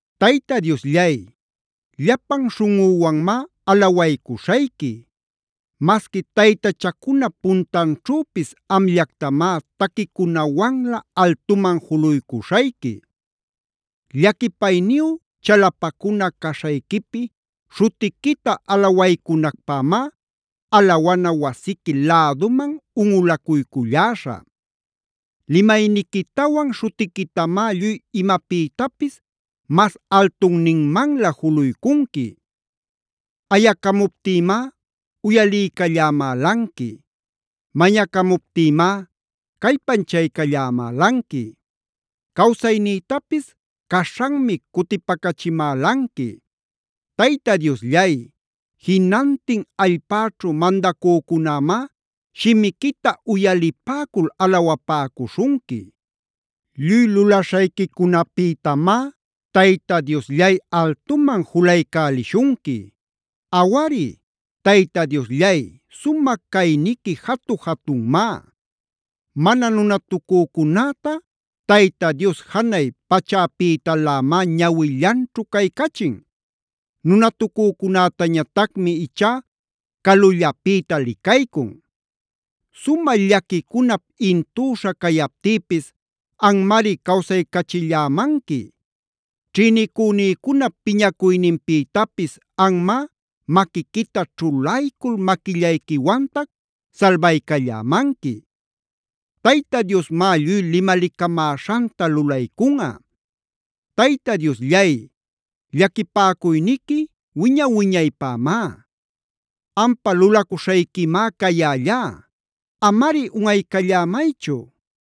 Tayta Diosllay, llapan śhuꞌüwanmá alawaycuśhayqui. Masqui taytachacunap puntanćhüpis amllactamá taquicunawanlä altuman juluycuśhayqui. Llaquipayniyu chalapacuna caśhayquipi śhutiquita alawaycunacpämá alawana wasiqui läduman unꞌulayculläśhä. Limayniquitawan śhutiquitamá lluy imapïtapis mas altunninmanlä juluycunqui. Ayacamuptïmá uyaliycallämälanqui. Mañacamuptïmá callpanchaycallämälanqui. Cawsaynïtapis caśhanmi cutipacachimälanqui. Tayta Diosllay, jinantin allpäćhu mandacücunämá shimiquita uyalipäcul alawapäcuśhunqui. Lluy lulaśhayquicunapïtamá Tayta Diosllay altuman julaycälishunqui. Awari, Tayta Diosllay sumä cayniqui jatu-jatunmá. Mana nunatucücunäta Tayta Dios janay pachäpïtalämá ñawillanćhu caycachin. Nunatucücunätañatacmi ichá calullapïta licaycun. Sumä llaquicunap intüśha cayaptïpis anmari cawsaycachillämanqui. Ćhïnicünïcunap piñacuyninpïtapis anmá maquiquita ćhulaycul maquillayquiwantac salbaycallämanqui. Tayta Diosmá lluy limalicamäśhanta lulaycunꞌa. Tayta Diosllay, llaquipäcuyniqui wiña-wiñaypämá. Ampa lulacuśhayquimá cayällá.a Amari unꞌaycallämaychu.